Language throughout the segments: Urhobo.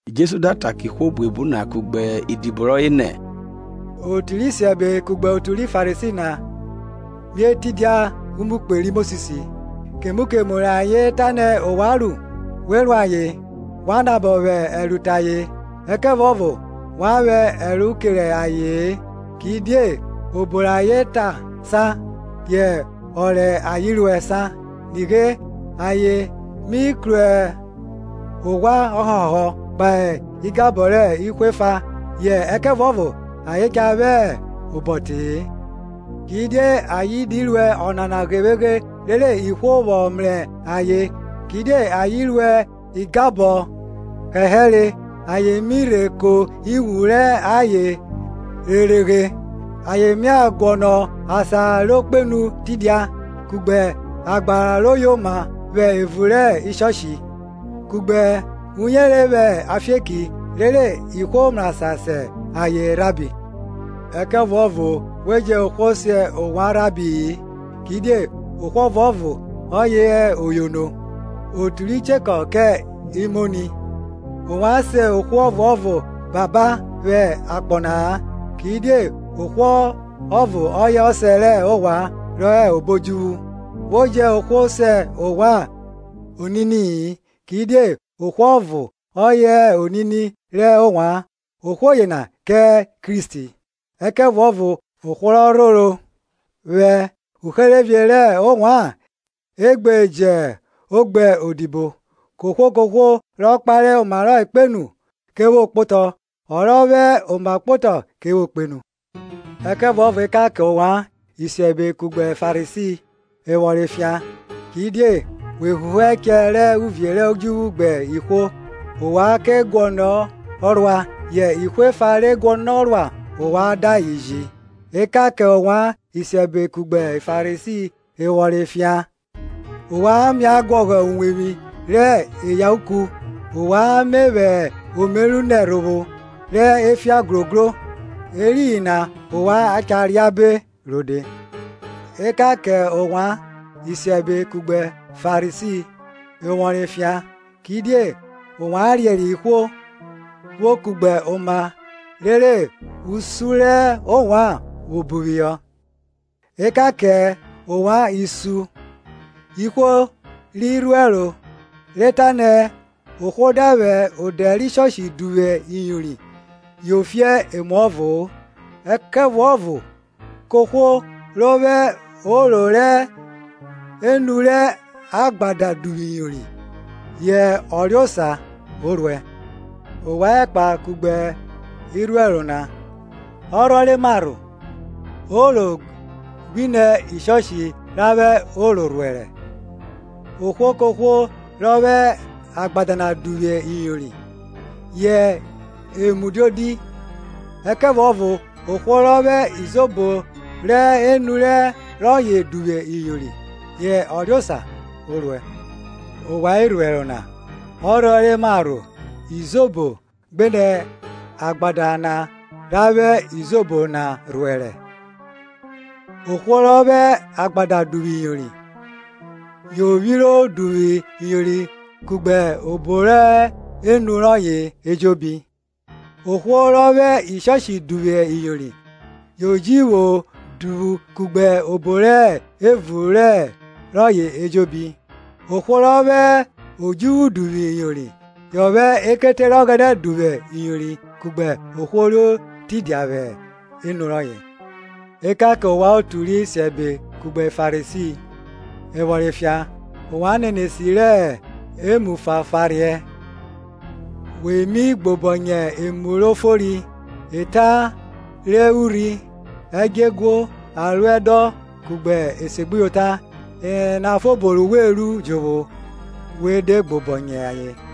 Jesu da ta kẹ ihwo buebu na kugbe idibo rọye nẹ, Otu rẹ isiẹbe kugbe otu ri Farisi na mia tidia umukpe ri Mosis; Kemu kemu rẹ ayen tanẹ ovwan ru, we ru ayen, wa nabọ vwẹ ẹro te ayen; ẹkẹvuọvo wa vwẹ ẹro kere aye-en, kidie obo rẹ ayen ta san, yẹ ọ rẹ ayen ruẹ san. Nighe, ayen mi kru oghwa ọhọhọhọ kpahe igabọ rẹ ihwo efa, yẹ ayen cha vwẹ obọ te-e. Kidie ayen di ruẹ ọnana ghevweghe rere ihwo vwọ mrẹ ayen; kidie ayen ruẹ igbabọ hẹhẹre, ayen mi rhe ko iwun rẹ ayen reghereghe. Ayen mia guọnọ asan ro kpenu tidia, kugbe agbara ro yoma vwẹ evun rẹ Sinagọg, kugbe uyere vwẹ afieki, rere ihwo mrasan se ayen iyono. Ẹkẹvuọvo we jẹ ohwo se ovwan iyono-o; kidie ohwo ọvuọvo ọye hẹ oyono, otu ri chekọ kẹ imoni. Ovwan sẹ ohwo ọvuọvo ọsẹ vwẹ akpọ na-a; Kidie ohwo ọvo ọye ọsẹ rẹ ovwan rọ hẹ obo odjuvwu. We jẹ ohwo se ovwan onini-i; Kidie ohwo ọvo ọye hẹ onini rẹ ovwan, ohwo yena hẹ Kristi. Ẹkẹvuọvo ohwo rọ rhoro vwẹ uherevie rẹ ovwan e gbe jo gbe odibo. Kohwo kohwo ro kpare oma kpenu, ke vwo kpotọ; ọ rọ vwẹ oma kpotọ ke vwo kpenu. Ẹkẹvuọvo ekan kẹ ovwan, isiẹbe kugbe Farisi, evworọn efian! kidie we huhu ẹchẹ rẹ uvie rẹ odjuvwu gbe ihwo; ovwan guọnọ ruọ-ọ, yẹ ihwo efa re guọnọ ruọ ovwan da ayen ji. Ekan kẹ ovwan, isiẹbe kugbe Farisi, evwọrọn efian! ovwan mia guọghọ uwevwi rẹ eyauku, ovwan me vwẹ omeru nẹ ẹrhovwo rẹ efian grogro, eriyin na ovwan cha reabe rode. Ekan kẹ ovwan isiẹbe kugbe Farisi, evwọrọn efian! kidie ovwan riẹriẹ ihwo vwo kugbe oma rere usun rẹ ovwan vwo bu phihọ. Ekan kẹ ovwan isun ihwo ri rhuẹro, re tanẹ, Ohwo da vwẹ odẹ rẹ ishọshi duvwu iyori, yo fi emuọvo-o, ẹkẹvuọvo ohwo rọ vwẹ oro rọ hẹ enu rẹ agbada duvwu iyori, yẹ ọ riosa o ruẹ. Ovwan ẹkpa kugbe irhuẹro na; ọrhọ re marho, oro gbinẹ ishọshi ra vwẹ oro na rhuẹre? Ohwo kohwo rọ vwẹ agbada na duvwu iyori, yẹ emu diodi; ẹkẹvuọvo ohwo rọ vwẹ izobo ro hẹ enu rọye duvwu iyori, yẹ ọ riosa o ruẹ. Ovwan irhuẹro na; ọrhọ re marho, izobo gbenẹ agbada na ra vwẹ izobo na rhuẹre? Ohwo rọ vwẹ agbada duvwu iyori, yo vwiro duvwu iyori kugbe obo rọ hẹ enu rọye ejobi. Ohwo ro vwẹ ishoshi duvwu iyori, o ji vwo duvwu iyori kugbe obo re hẹ evun rọye ejobi. Ohwo rọ vwẹ odjuvwu duvwu iyori, yọ vwẹ ekete rẹ Ọghẹnẹ duvwu iyori kugbe ohwo ro tidia vwẹ enu rọye. Ekan kẹ ovwan otu rẹ isiẹbe kugbe Farisi, evwọrọn efian! ovwan nenesi rẹ emu fanfaurhiẹ, we mi gbobọnyẹ emu ro fori, eta re urhi, ẹdjeguo, aruẹdọn kugbe esegbuyota; enana fobo ru we ru jovwo, we de gbobọnyẹ ayen.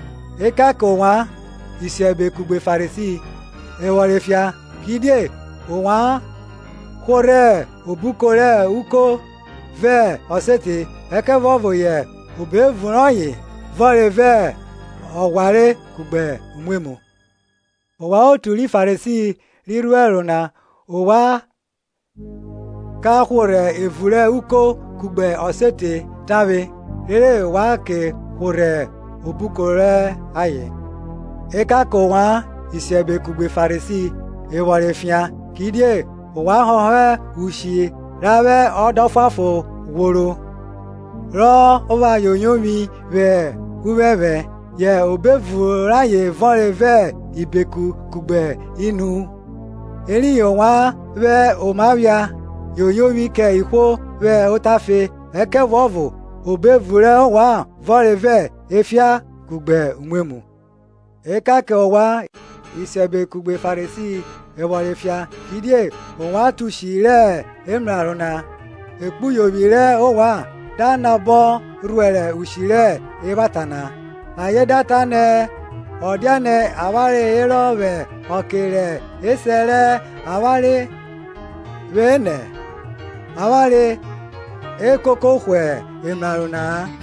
Ekan kẹ ovwan, isiẹbe kugbe Farisi, evwọrọn efian! kidie ovwan hworhẹ obuko rẹ uko vẹ ọsete, ẹkẹvuọvo yẹ obo evun rọyen vọnre vẹ ọghware kugbe umwemwu. Ovwan Farisi ri rhuẹro na, ovwan ka hworhẹ evun rẹ uko kugbe ọsete na tavwe, rere wa ke hworhẹ obuko rẹ ayen. Ekan kẹ ovwan, isiẹbe kugbe Farisi, evwọrọn efian! kidie ovwan họhọ ushi ra vwẹ oda ọfuanfon ghworo, rọ pha yoyovwi vwẹ uphẹnphẹn, yẹ obo evun rayen vọnre vẹ ibeku kugbe inuhu. Eriyin ovwan vwẹ oma phia yoyovwi kẹ ihwo vwẹ otafe, ẹkẹvuọvo obo evun rẹ ovwan vọnre vẹ efian kugbe umwemwu. Ekan kẹ ovwan, isiẹbe kugbe Farisi, evwọrọn efian! kidie ovwan tọn ushi rẹ emraro na, ekpuyovwi rẹ ovwan da nabọ rhuẹrẹ ushi rẹ evwata na. Ayen da ta nẹ, ọ diane avwanre herọ vwẹ ọke rẹ esẹ rẹ avwanre vwenẹ, avwanre e koko hwe emraro na-a.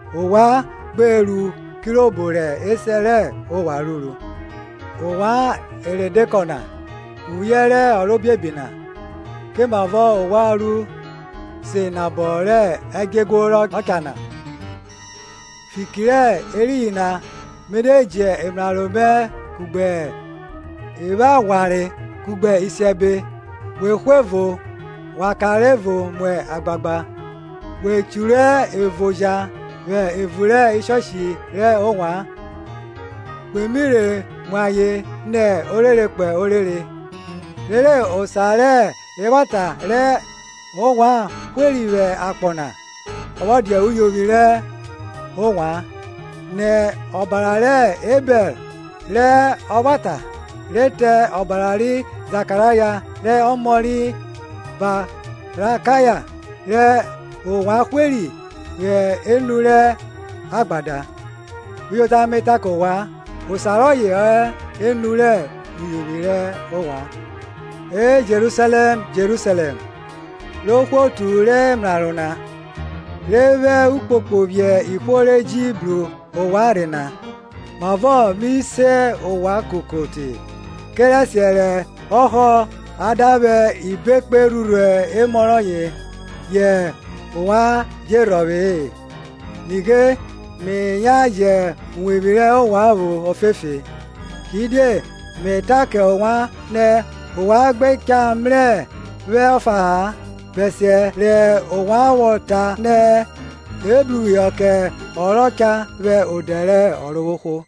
Ovwan gbe ru kirobo rẹ esẹ rẹ ovwan ruru. Ovwan eredekọ na, uvwiẹ rẹ ọrobiebi na, komavọ ovwan ru se nabọ rẹ ẹdjeguo rọ cha na? Fiki re eriyin na, mi de ji emraro mẹ kugbe evwaghwanre, kugbe isiẹbe, we hwe evo, wa kanre evo mu agbagba; we che ru evo oja vwẹ evun rẹ Sinagọg rẹ ovwan, we mi rhe mu ayen nẹ orere kpo orere. Rere osa rẹ evwata rẹ ovwan hweri vwẹ akpọ na vwọ dia uyovwi rẹ ovwan, nẹ ọbara rẹ Ebẹl rẹ ọvwata, re te ọbara ri Zakaraya rẹ ọmọ ri Barakaya rẹ ovwan hweri vwẹ enu rẹ agbada. Uyota me ta kẹ ovwan, osa rọye ọ hẹ enu rẹ uyovwi rẹ ovwan. E Jerusalẹm, Jerusalẹm, ro hwe otu rẹ emraro na, rọ vwẹ elalọ phiẹ ihwo re ji bru ovwan rhe na! mavọ mi se ovwan koko te kerẹsiẹ rẹ ọhọ a da vwẹ ibekpe rhurhu emọ rọye, yẹ ovwan je rhọvwe-e. Nighe me yan jẹ uwevwi rẹ ovwan vwo ofefe. Kidie me ta kẹ ovwan nẹ, Ovwan gbe cha mrẹ vwẹ ọfa-a, bẹsiẹ rẹ ovwan vwọ ta nẹ, Ebruphihọ kẹ ọ rọ cha vwẹ odẹ rẹ Ọrovwohwo.